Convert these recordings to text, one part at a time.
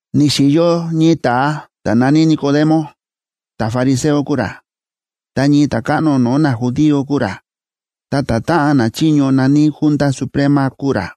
Ni̱xi̱yo ñii ta̱a ta̱ na̱ní Nicodemo, ta̱fariseo kúu ra, ta ñii ta̱káꞌno no̱o̱ najudío kúu ra, ta ta̱táꞌan nachiño na̱ní Junta Suprema kúu ra.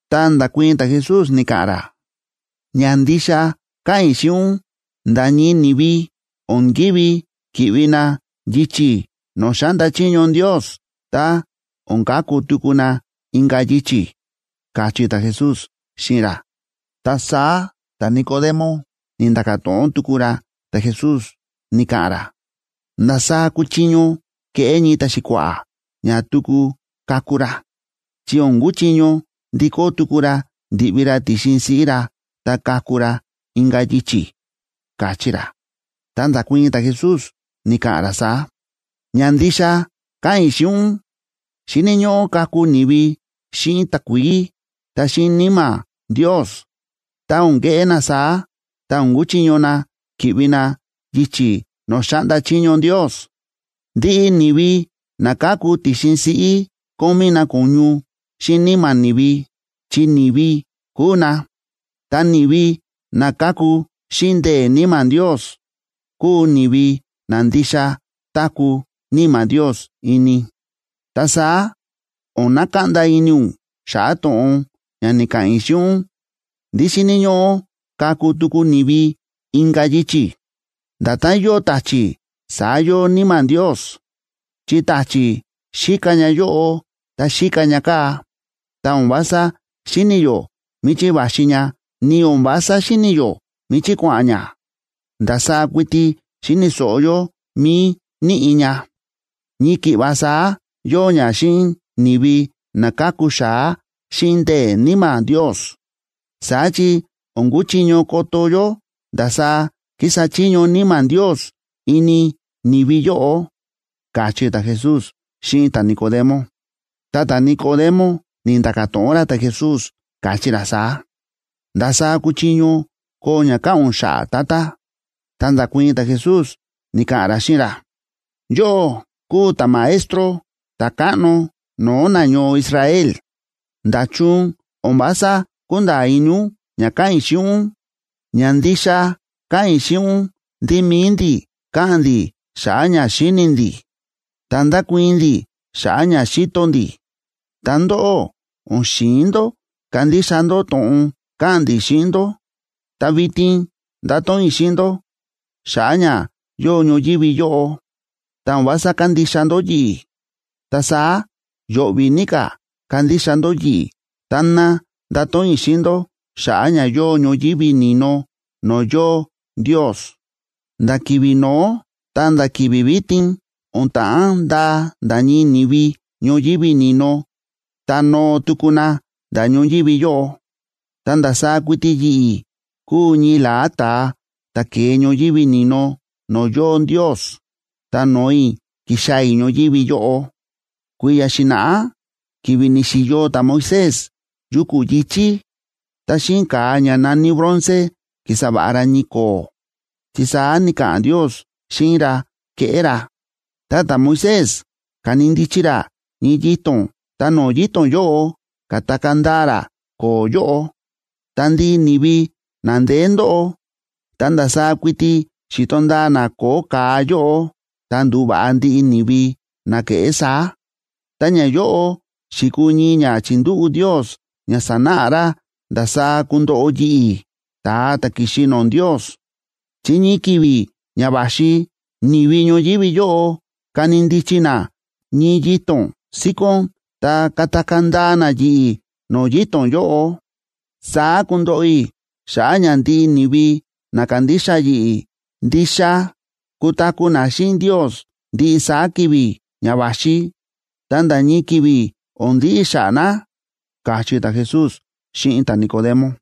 Ta nda̱kuii̱n ta̱Jesús, ni̱ka̱ꞌa̱n ra: ―Ña ndixa káꞌa̱n i̱ xíꞌin ún, nda̱ ñii ni̱vi o̱n ki̱ví ki̱ꞌvi na yichi̱ no̱o̱ xáꞌnda chiño Ndios tá o̱n kaku tuku na inka̱ yichi̱ ―káchí ta̱Jesús xíꞌin ra. Ta saá ta̱Nicodemo ni̱nda̱ka̱ to̱ꞌon tuku ra ta̱Jesús, ni̱ka̱ꞌa̱n ra: ―¿Ndasaá kuchiño keꞌé ñii ta̱xi̱kua̱ꞌa̱ ña tuku kaku ra?, chi o̱n kuchiño ndikó tuku ra ndi̱ꞌvi ra ti̱xin siꞌí ra ta kaku ra inka̱ yichi̱ ―káchí ra. Ta nda̱kuii̱n ta̱Jesús, ni̱ka̱ꞌa̱n ra saá: ―Ña ndixa káꞌa̱n i̱ xíꞌin ún, xíni̱ ñóꞌó kaku ni̱vi xíꞌin takuií ta xíꞌin Níma̱ Ndios. Tá o̱n keꞌé na saá, ta o̱n kuchiño na ki̱ꞌvi na yichi̱ no̱o̱ xáꞌnda chiño Ndios. Ndiꞌi ni̱vi na káku ti̱xin siꞌí kómí na ko̱ñu xíꞌin níma̱ ni̱vi, chi ni̱vi kúu na. Ta ni̱vi na káku xíꞌin ndee̱ Níma̱ Ndios kúu ni̱vi na ndixa táku̱ Níma̱ Ndios ini. Ta saá o̱n nakaꞌnda ini ún xa̱ꞌa̱ to̱ꞌon ña ni̱ka̱ꞌa̱n i̱ xíꞌin ún ndí xíni̱ ñóꞌó kaku tuku ni̱vi inka̱ yichi̱. Nda̱tán yóo ta̱chi̱ saá yóo Níma̱ Ndios, chi ta̱chi̱ xíka ña yóꞌo ta xíka ña kaa̱, ta o̱n vása xíni̱ yó míchí va̱xi ña, ni o̱n vása xíni̱ yó míchí kua̱ꞌa̱n ña. Ndasaá kuiti xíni̱ so̱ꞌo yó mí níꞌi̱ ña. Ñii ki̱ꞌva saá yóo ña xíꞌin ni̱vi na ka̱ku xa̱á xíꞌin ndee̱ Níma̱ Ndios. Saá chi o̱n kúchiño koto yó ndasaá kísa chiño Níma̱ Ndios ini ni̱vi yóꞌo ―káchí ta̱Jesús xíꞌin ta̱Nicodemo. Ta ta̱Nicodemo ni̱nda̱ka̱ to̱ꞌon ra ta̱Jesús, káchí ra saá: ―¿Ndasaá kuchiño koo ña káꞌa̱n ún xa̱ꞌa̱, Tata? Ta nda̱kuii̱n ta̱Jesús, ni̱ka̱ꞌa̱n ra xíꞌin ra: ―Yóꞌó kúu ta̱maestro ta̱káꞌno no̱o̱ nañoo Israel. ¿Nda̱chun o̱n vása kúnda̱a̱ ini ún ña káꞌa̱n i̱ xíꞌin ún? Ña ndixa káꞌa̱n i̱ xíꞌin ún ndí mi̱i ndi̱ káꞌa̱n ndi̱ xa̱ꞌa̱ ña xíni̱ ndi̱, ta ndákuii̱n ndi̱ xa̱ꞌa̱ ña xi̱to ndi̱, ta ndóꞌó o̱n xi̱in ndó kandixa ndó to̱ꞌon káꞌa̱n ndi̱ xíꞌin ndó. Ta vitin ndáto̱ꞌon i̱ xíꞌin ndó xa̱ꞌa̱ ña yóo ñoyívi yóꞌo, ta o̱n vása kándixa ndó yi̱ꞌi̱. Ta saá yo̱ꞌvi̱ ní ka̱ kandixa ndó yi̱ꞌi̱ táná ndato̱ꞌon i̱ xíꞌin ndó xa̱ꞌa̱ ña yóo ñoyívi ni̱no no̱o̱ yóo Ndios. ’Nda̱ ki̱vi̱ no̱ó ta̱nda̱ ki̱vi̱ vitin o̱n ta̱ꞌán ndaa nda̱ ñii ni̱vi ñoyívi ni̱no ta noo tuku na nda̱ ñoyívi yóꞌo. Ta ndasaá kuiti yi̱ꞌi̱ kúu ñii la̱á ta̱a ta̱ ke̱e ñoyívi ni̱no no̱o̱ yóo Ndios, ta no̱o i̱ ki̱xaa̱ i̱ ñoyívi yóꞌo. Kui̱ya̱ xi̱na̱ꞌá ki̱vi̱ ni̱xi̱yo ta̱Moisés yuku̱ yi̱chí, ta xíꞌin ka̱a ña na̱ní bronce ki̱sa va̱ꞌa ra ñii ko̱o̱, chi saá ni̱ka̱ꞌa̱n Ndios xíꞌin ra keꞌé ra. Ta ta̱Moisés ka̱ni ndichi ra ñii yito̱n ta no̱o̱ yito̱n yóꞌo, ka̱takaa̱ ndaa ra ko̱o̱ yóꞌo. Ta ndiꞌi ni̱vi na ndeé ndóꞌo, tá ndasaá kuiti xi̱to ndaa na ko̱o̱ ka̱a yóꞌo, ta ndu̱va̱ꞌa ndiꞌi ni̱vi na ke̱ꞌé saá. Ta ñayóꞌo xi̱kuu ñii ña chi̱ndúꞌu̱ Ndios ña sanáꞌa ra ndasaá kundoꞌo yi̱ꞌi̱, ta̱a ta̱ ki̱xi no̱o̱ Ndios, chi ñii ki̱vi̱ ña va̱xi ni̱vi ñoyívi yóꞌo kani ndichi na ñii yito̱n síkón ta katakaa̱ ndaa na yi̱ꞌi̱ no̱o̱ yito̱n yóꞌo. Saá kundoꞌo i̱ xa̱ꞌa̱ ña ndiꞌi ni̱vi na kandixa yi̱ꞌi̱, ndixa kutaku̱ na xíꞌin Ndios ndiꞌi saá ki̱vi̱ ña va̱xi, ta nda̱ ñii ki̱vi̱ o̱n ndiꞌi xa̱ꞌa̱ na ―káchí ta̱Jesús xíꞌin ta̱Nicodemo.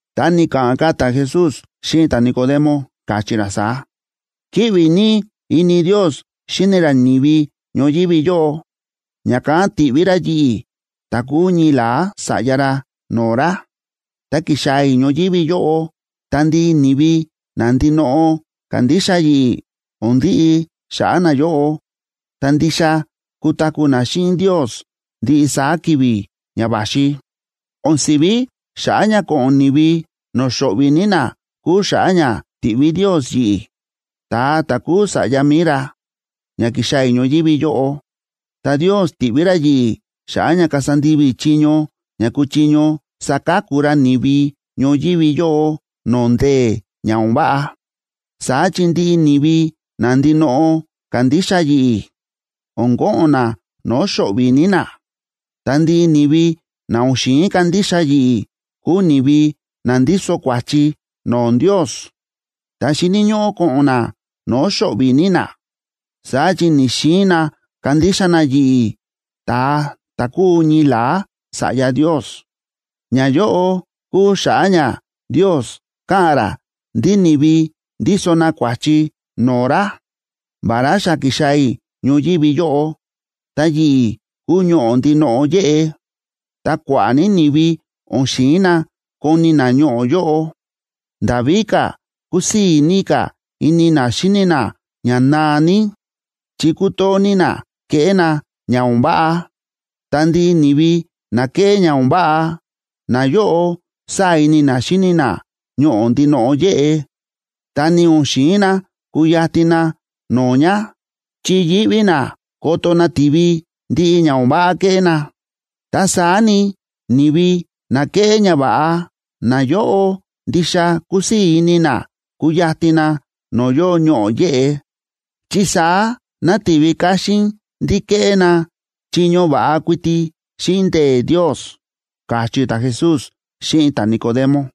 Ta ni̱ka̱ꞌa̱n ka̱ ta̱Jesús xíꞌin ta̱Nicodemo, káchí ra saá: ―Kíꞌvi ní ini Ndios xíni ra ni̱vi ñoyívi yóꞌo, ña̱kán ti̱ꞌví ra yi̱ꞌi̱, ta kúu ñii la̱á Sa̱ꞌya ra no̱o̱ ra, ta ki̱xaa̱ i̱ ñoyívi yóꞌo, ta ndiꞌi ni̱vi na ndinoꞌo kandixa yi̱ꞌi̱, o̱n ndiꞌi xa̱ꞌa̱ nayóꞌo, ta ndixa kutaku̱ na xíꞌin Ndios ndiꞌi saá ki̱vi̱ ña va̱xi. O̱n si̱ví xa̱ꞌa̱ ña ko̱ꞌo̱n ni̱vi no̱o̱ xo̱ꞌvi̱ ní na kúu xa̱ꞌa̱ ña ti̱ꞌví Ndios yi̱ꞌi̱, ta̱a ta̱ kúu Sa̱ꞌya mi̱i ra, ña ki̱xaa̱ i̱ ñoyívi yóꞌo. Ta Ndios ti̱ꞌví ra yi̱ꞌi̱ xa̱ꞌa̱ ña kasa ndivi i̱ chiño ña kuchiño saka̱ku ra ni̱vi ñoyívi yóꞌo no̱o̱ ndee̱ ña o̱n váꞌa. ’Saá chi ndiꞌi ni̱vi na ndinoꞌo kándixa yi̱ꞌi̱, o̱n ko̱ꞌo̱n na no̱o̱ xo̱ꞌvi̱ ní na. Ta ndiꞌi ni̱vi na o̱n xi̱in kandixa yi̱ꞌi̱ kúu ni̱vi na ndíso kua̱chi no̱o̱ Ndios, ta xíni̱ ñóꞌó ko̱ꞌo̱n na no̱o̱ xo̱ꞌvi̱ ní na. Saá chi ni̱‑xiin na kandixa na yi̱ꞌi̱, ta̱a ta̱ kúu ñii la̱á Sa̱ꞌya Ndios. Ñayóꞌo kúu xa̱ꞌa̱ ña Ndios káꞌa̱n ra ndí ni̱vi ndíso na kua̱chi no̱o̱ ra: vará xa ki̱xaa̱ i̱ ñoyívi yóꞌo, ta yi̱ꞌi̱ kúu Ñoꞌo̱ ndinoꞌo yéꞌe, ta kua̱ꞌa̱ ní ni̱vi o̱n xi̱in na koni na Ñoꞌo̱ yóꞌo. Nda̱ víka̱, kúsii̱ ní ka̱ ini na xíni na ña naa ní, chi kútoo ní na kéꞌé na ña o̱n váꞌa. Ta ndiꞌi ni̱vi na kéꞌé ña o̱n váꞌa, nayóꞌo sáa̱ ini na xíni na Ñoꞌo̱ ndinoꞌo yéꞌe, ta ni o̱n xi̱in na kuyatin na no̱o̱ ña, chi yíꞌví na ko̱to̱ nativi ndiꞌi ña o̱n váꞌa ke̱ꞌé na. Ta saá ni, ni̱vi na kéꞌé ñava̱ꞌa, nayóꞌo ndixa kúsii̱ ini na kúyatin na no̱o̱ yóo Ñoꞌo̱ yéꞌe, chi saá nativi káxín ndí kéꞌé na chiño va̱ꞌa kuiti xíꞌin ndee̱ Ndios ―káchí ta̱Jesús xíꞌin ta̱Nicodemo.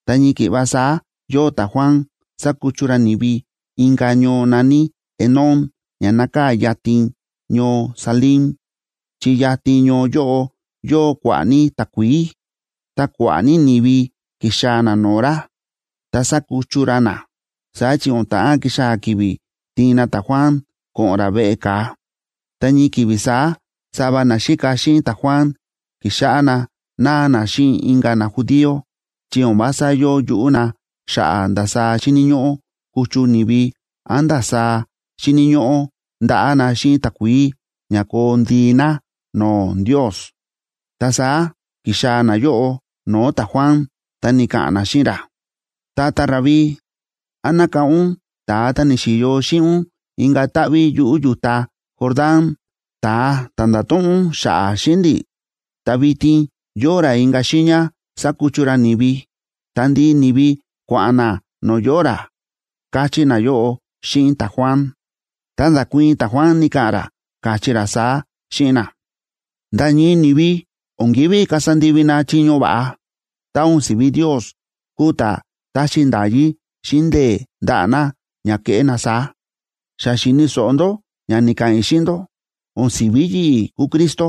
Ta ñii ki̱ꞌva saá yóo ta̱Juan sákuchu ra ni̱vi inka̱ ñoo na̱ní Enón ña nákaa̱ yatin ñoo Salim, chi yatin ñoo yóꞌo yóo kua̱ꞌa̱ ní takuií. Ta kua̱ꞌa̱ ní ni̱vi ki̱xaa̱ na no̱o̱ ra, ta sa̱kuchu ra na. Saá chi o̱n ta̱ꞌán kixaa̱ ki̱vi̱ tiin na ta̱Juan ko̱ꞌo̱n ra veꞌe ka̱a. Ta ñii ki̱vi̱ saá sava naxíka xíꞌin ta̱Juan ki̱xáꞌá na náa na xíꞌin inka̱ najudío chi o̱n vása yóo yuꞌú na xa̱ꞌa̱ ndasaá xíni̱ ñóꞌó kuchu ni̱vi án ndasaá xíni̱ ñóꞌó ndaꞌá na xíꞌin takuií ña koo ndii na no̱o̱ Ndios. Ta saá ki̱xaa̱ nayóꞌo no̱o̱ ta̱Juan ta ni̱ka̱ꞌa̱n na xíꞌin ra: ―Tata Rabí, ¿án nákáꞌán ún ta̱a ta̱ ni̱xi̱yo xíꞌin ún inka̱ táꞌví yuꞌu̱ yu̱ta Jordán, ta̱a ta̱ nda̱to̱ꞌon ún xa̱ꞌa̱ xíꞌin ndi̱? Ta vitin yóo ra inka̱ xiiña sákuchu ra ni̱vi, ta ndiꞌi ni̱vi kua̱ꞌa̱n na no̱o̱ yóo ra ―káchí nayóꞌo xíꞌin ta̱Juan. Ta nda̱kuii̱n ta̱Juan ni̱ka̱ꞌa̱n ra, káchí ra saá xíꞌin na: ―Nda̱ ñii ni̱vi o̱n ki̱ví kasa ndivi na chiño va̱ꞌa, tá o̱n si̱ví Ndios kúu ta̱ taxi nda̱yí xíꞌin ndee̱ ndaꞌa̱ na ña keꞌé na saá. Xa xi̱ni̱ so̱ꞌo ndó ña ni̱ka̱ꞌa̱n i̱ xíꞌin ndó: “O̱n si̱ví yi̱ꞌi̱ kúu Cristo,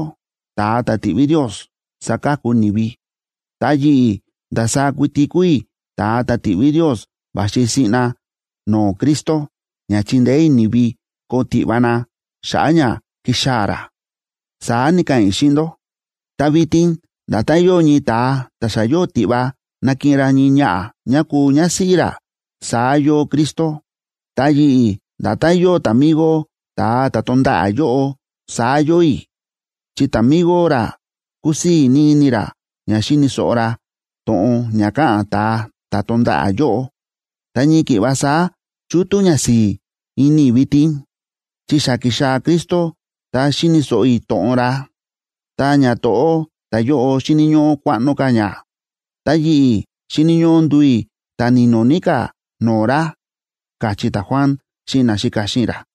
ta̱a ta̱ ti̱ꞌví Ndios saka̱ku ni̱vi. Ta yi̱ꞌi̱ ndasaá kuiti kúu i̱ ta̱a ta̱ ti̱ꞌví Ndios va̱xi siꞌna no̱o̱ Cristo ña chindeé i̱ ni̱vi koo tiꞌva na xa̱ꞌa̱ ña kixaa̱ ra”, saá ni̱ka̱ꞌa̱n i̱ xíꞌin ndó. Ta vitin nda̱tán yóo ñii ta̱a ta̱ xa yóo tiꞌva nakiꞌin ra ñii ñaꞌa̱ ñá kuu ñásíꞌí ra, saá yóo Cristo. Ta yi̱ꞌi̱ nda̱tán yóo ta̱migo ta̱a ta̱ tonda̱ꞌa̱ yóꞌo, saá yóo i̱, chi ta̱migo ra kúsii̱ ní ini ra ña xíni̱ so̱ꞌo ra to̱ꞌon ña káꞌa̱n ta̱a ta̱ tonda̱ꞌa̱ yóꞌo. Ta ñii ki̱ꞌva saá chútú ñasi̱i̱ ini i̱ vitin, chi xa ki̱xaa̱ Cristo ta xíni̱ so̱ꞌo i̱ to̱ꞌon ra. Ta ñato̱ꞌó ta̱yóꞌo xíni̱ ñóꞌó kuaꞌno ka̱ ña, ta yi̱ꞌi̱ xíni̱ ñóꞌó nduu i̱ ta̱ ni̱no̱ ní ka̱ no̱o̱ ra ―káchí ta̱Juan xíꞌin naxíka xíꞌin ra.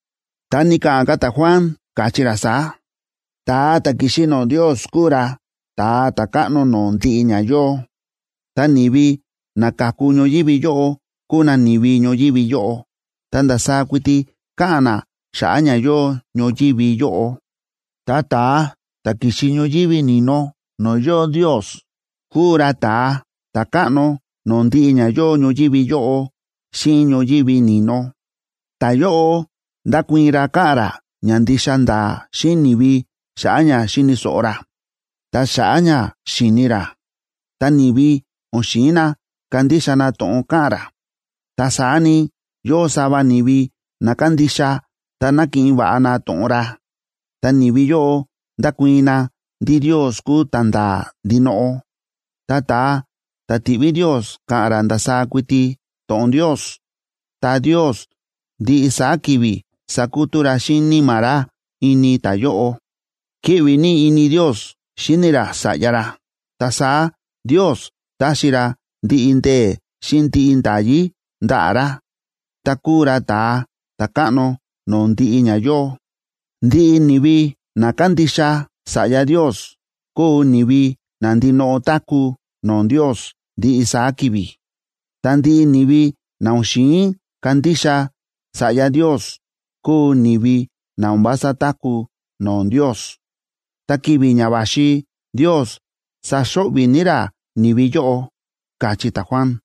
Ta ni̱ka̱ꞌa̱n ka̱ ta̱Juan, káchí ra saá: ―Ta̱a ta̱ ki̱xi no̱o̱ Ndios kúu ra ta̱a ta̱káꞌno no̱o̱ ndiꞌi ña yóo. Ta ni̱vi na ka̱ku ñoyívi yóꞌo kúu na ni̱vi ñoyívi yóꞌo, ta ndasaá kuiti káꞌa̱n na xa̱ꞌa̱ ña yóo ñoyívi yóꞌo. Ta ta̱a ta̱ ki̱xi ñoyívi ni̱no no̱o̱ yóo Ndios, kúu ra ta̱a ta̱káꞌno no̱o̱ ndiꞌi ña yóo ñoyívi yóꞌo xíꞌin ñoyívi ni̱no. Ta̱yóꞌo ndákuii̱n ra káꞌa̱n ra ña ndixa nda̱a̱ xíꞌin ni̱vi xa̱ꞌa̱ ña xi̱ni̱ so̱ꞌo ra, ta xa̱ꞌa̱ ña xi̱ni ra, ta ni̱vi o̱n xi̱in na kandixa na to̱ꞌon káꞌa̱n ra. Ta saá ni, yóo sava ni̱vi na kándixa ta nákiꞌin va̱ꞌa na to̱ꞌon ra, ta ni̱vi yóꞌo ndákuii̱n na ndí Ndios kúu ta̱nda̱a̱ ndinoꞌo. Ta ta̱a ta̱ ti̱ꞌví Ndios káꞌa̱n ra ndasaá kuiti to̱ꞌon Ndios, ta Ndios ndiꞌi saá ki̱vi̱ sákutú ra xíꞌin Níma̱ ra ini ta̱yóꞌo. Kíꞌvi ní ini Ndios xíni ra Sa̱ꞌya ra, ta saá Ndios ta̱xi ra ndiꞌi ndee̱ xíꞌin ndiꞌi nda̱yí ndaꞌa̱ ra, ta kúu ra ta̱a ta̱káꞌno no̱o̱ ndiꞌi ña yóo. Ndiꞌi ni̱vi na kándixa Sa̱ꞌya Ndios kúu ni̱vi na ndinoꞌo táku̱ no̱o̱ Ndios ndiꞌi saá ki̱vi̱. Ta ndiꞌi ni̱vi na o̱n xi̱in kandixa Sa̱ꞌya Ndios kúu ni̱vi na o̱n vása táku̱ no̱o̱ Ndios, ta ki̱vi̱ ña va̱xi Ndios saxo̱ꞌvi̱ ní ra ni̱vi yóꞌo ―káchí ta̱Juan.